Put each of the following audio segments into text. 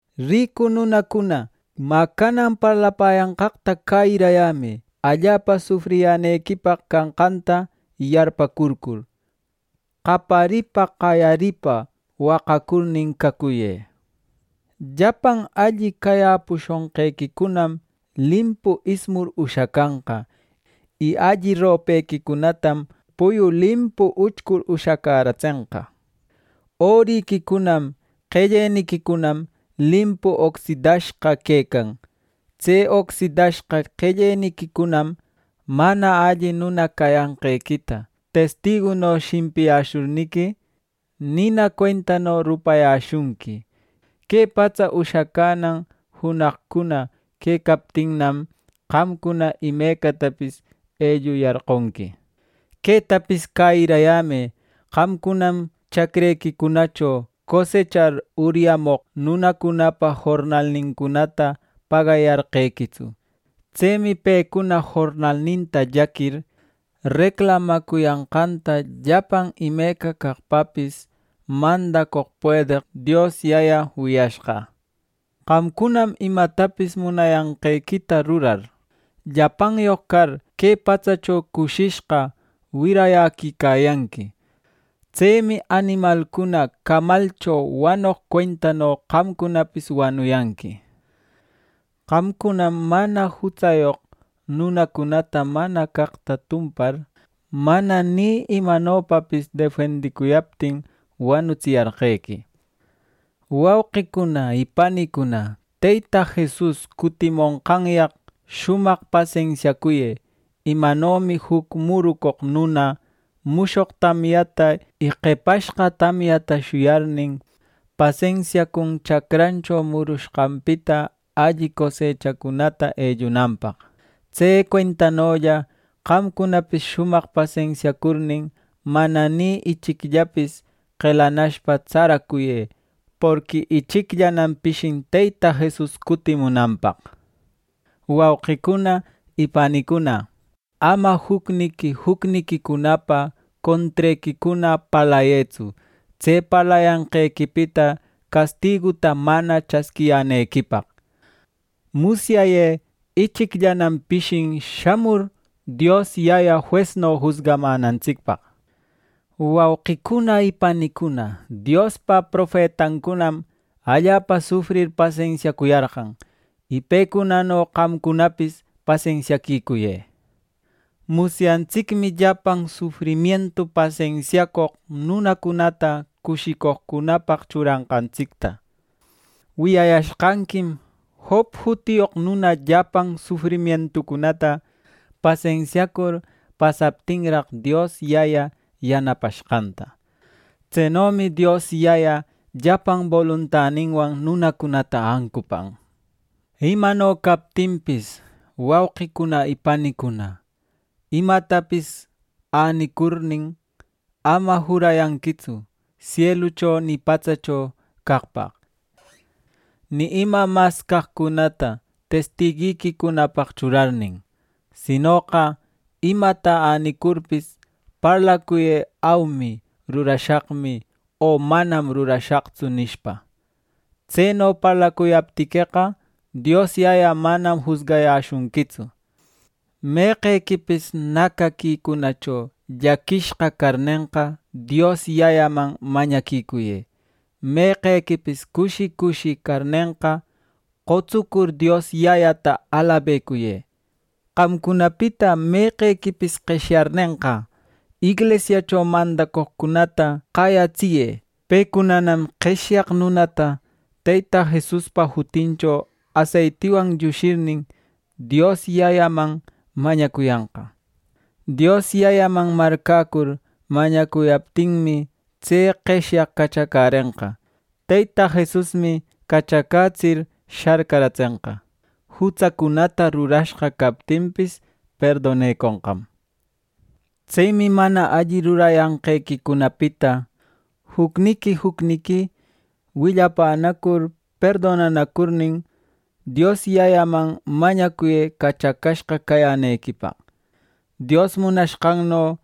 Ricu nunacuna, mä canan parlapäyanqaqta cäyirayämë. Allapa sufriyänequipaq canqanta yarpäcurcur, qaparipa qayaripa waqacurnin cacuyë. Llapan alli cayäpushonqequicunam limpu ismur ushacanqa; y alli ropequicunatam puyu limpu uchcur ushacäratsenqa. Oriquicunam qelleniquicunam limpu ocsidashqa quecan. Tse ocsidashqa qelleniquicunam mana alli nuna cayanqequita testiguno shimpiyäshurniqui, nina cuentano rupayäshunqui. Que patsa ushacänan junaqcuna quecaptinnam, qamcuna imecatapis elluyarqonqui. ¡Quetapis cäyirayämë! Qamcunam chacrequicunacho cosechar, uryamoq nunacunapa jornalnincunata pagayarqequitsu. Tsemi pecuna jornalninta llaquir, reclamacuyanqanta llapan imeca caqpapis mandacoq puedeq Dios Yaya wiyashqa. Qamcunam imatapis munayanqequita rurar, llapanyoq car, que patsacho cushishqa wirayäquicayanqui. Tsemi animalcuna camalcho wanoq cuentano qamcunapis wanuyanqui. Qamcunam mana jutsayoq nunacunata mana caqta tumpar, mana ni imanopapis defendicuyaptin, wanutsiyarqequi. Wauqicuna y panicuna, Teyta Jesus cutimonqanyaq shumaq pasensiacuyë. Imanomi juc murucoq nuna mushoq tamyata y qepashqa tamyata shuyarnin, pasensiacun chacrancho murushqanpita alli cosechacunata ellunanpaq; Tse cuentanolla qamcunapis shumaq pasensiacurnin, mana ni ichicllapis qelanashpa, tsaracuyë. Porqui ichicllanam pishin Teyta Jesus cutimunanpaq. Wauqicuna y panicuna, ama jucniqui jucniquicunapa contrequicuna parlayëtsu, tse parlayanqequipita castiguta mana chasquiyänequipaq. Musyayë: Ichicllanam pishin shamur, Dios Yaya juesno jusgamänantsicpaq. Wauqicuna y panicuna, Diospaq profetacunam allapa sufrir pasensiacuyarqan; y pecunano qamcunapis pasensiacuyë. Musyantsicmi llapan sufrimientu pasensiacoq nunacunata cushicoqcunapaq churanqantsicta. Wiyayashqanquim Job jutiyoq nuna llapan sufrimientucunata pasensiacur pasaptinraq, Dios Yaya yanapashqanta. Tsenomi Dios Yaya llapan boluntaninwan nunacunata ancupan. Imano captinpis, wauqicuna y panicuna, imatapis änicurnin, ama jurayanquitsu sielucho ni patsacho caqpaq, ni ima mas caqcunata testiguiquicunapaq churarnin. Sinoqa imata änicurpis, parlacuyë: “Aumi, rurashaqmi” o “Manam rurashaqtsu” nishpa. Tseno parlacuyaptiqueqa, Dios Yaya manam jusgayäshunquitsu. Meqequipis nacaquicunacho llaquishqa carnenqa, Dios Yayaman mañaquicuyë. Meqequipis cushi cushi carnenqa, qotsucur Dios Yayata alabecuyë. Qamcunapita meqequipis qeshyarnenqa, inglisiacho mandacoqcunata qayatsiyë. Pecunanam qeshyaq nunata Teyta Jesuspa jutincho aseitiwan llushirnin, Dios Yayaman mañacuyanqa. Dios Yayaman marcäcur mañacuyaptinmi, tse qeshyaq cachacärenqa. Teyta Jesusmi cachacätsir sharcaratsenqa; jutsacunata rurashqa captinpis, perdoneconqam. Tsemi mana alli rurayanqequicunapita jucniqui jucniqui willapänacur perdonanacurnin, Dios Yayaman mañacuyë cachacashqa cayänequipaq. Dios munashqanno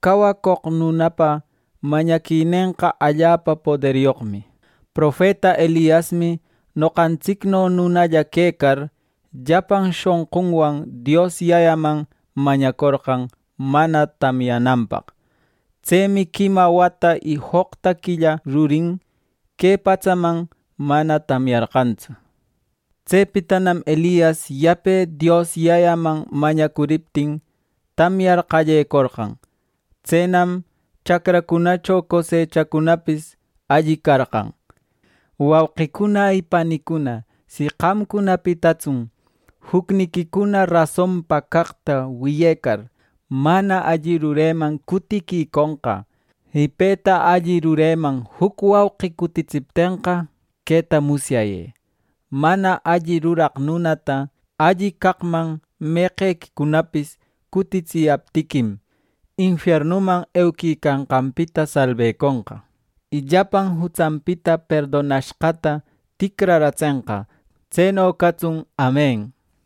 cawacoq nunapa mañaquinenqa allapa poderyoqmi. Profeta Eliasmi noqantsicno nunalla quecar, llapan shonqunwan Dios Yayaman mañacorqan mana tamyananpaq. Tsemi quima wata y joqta quilla rurin, que patsaman mana tamyarqantsu. Tsepitanam Elias yape Dios Yayaman mañacuriptin, tamyar qallecorqan. Tsenam chacracunacho cosechacunapis alli carqan. Wauqicuna y panicuna, si qamcunapitatsun jucniquicuna rasonpa caqta wiyecar, mana alli rureman cutiquiconqa, y peta alli rureman juc wauqi cutitsiptenqa, queta musyayë: Mana alli ruraq nunata alli caqman meqequicunapis cutitsiyaptiquim, infiernuman euquicanqanpita salbeconqa, y llapan jutsanpita perdonashqata ticraratsenqa. ˻Tseno catsun. Amen˼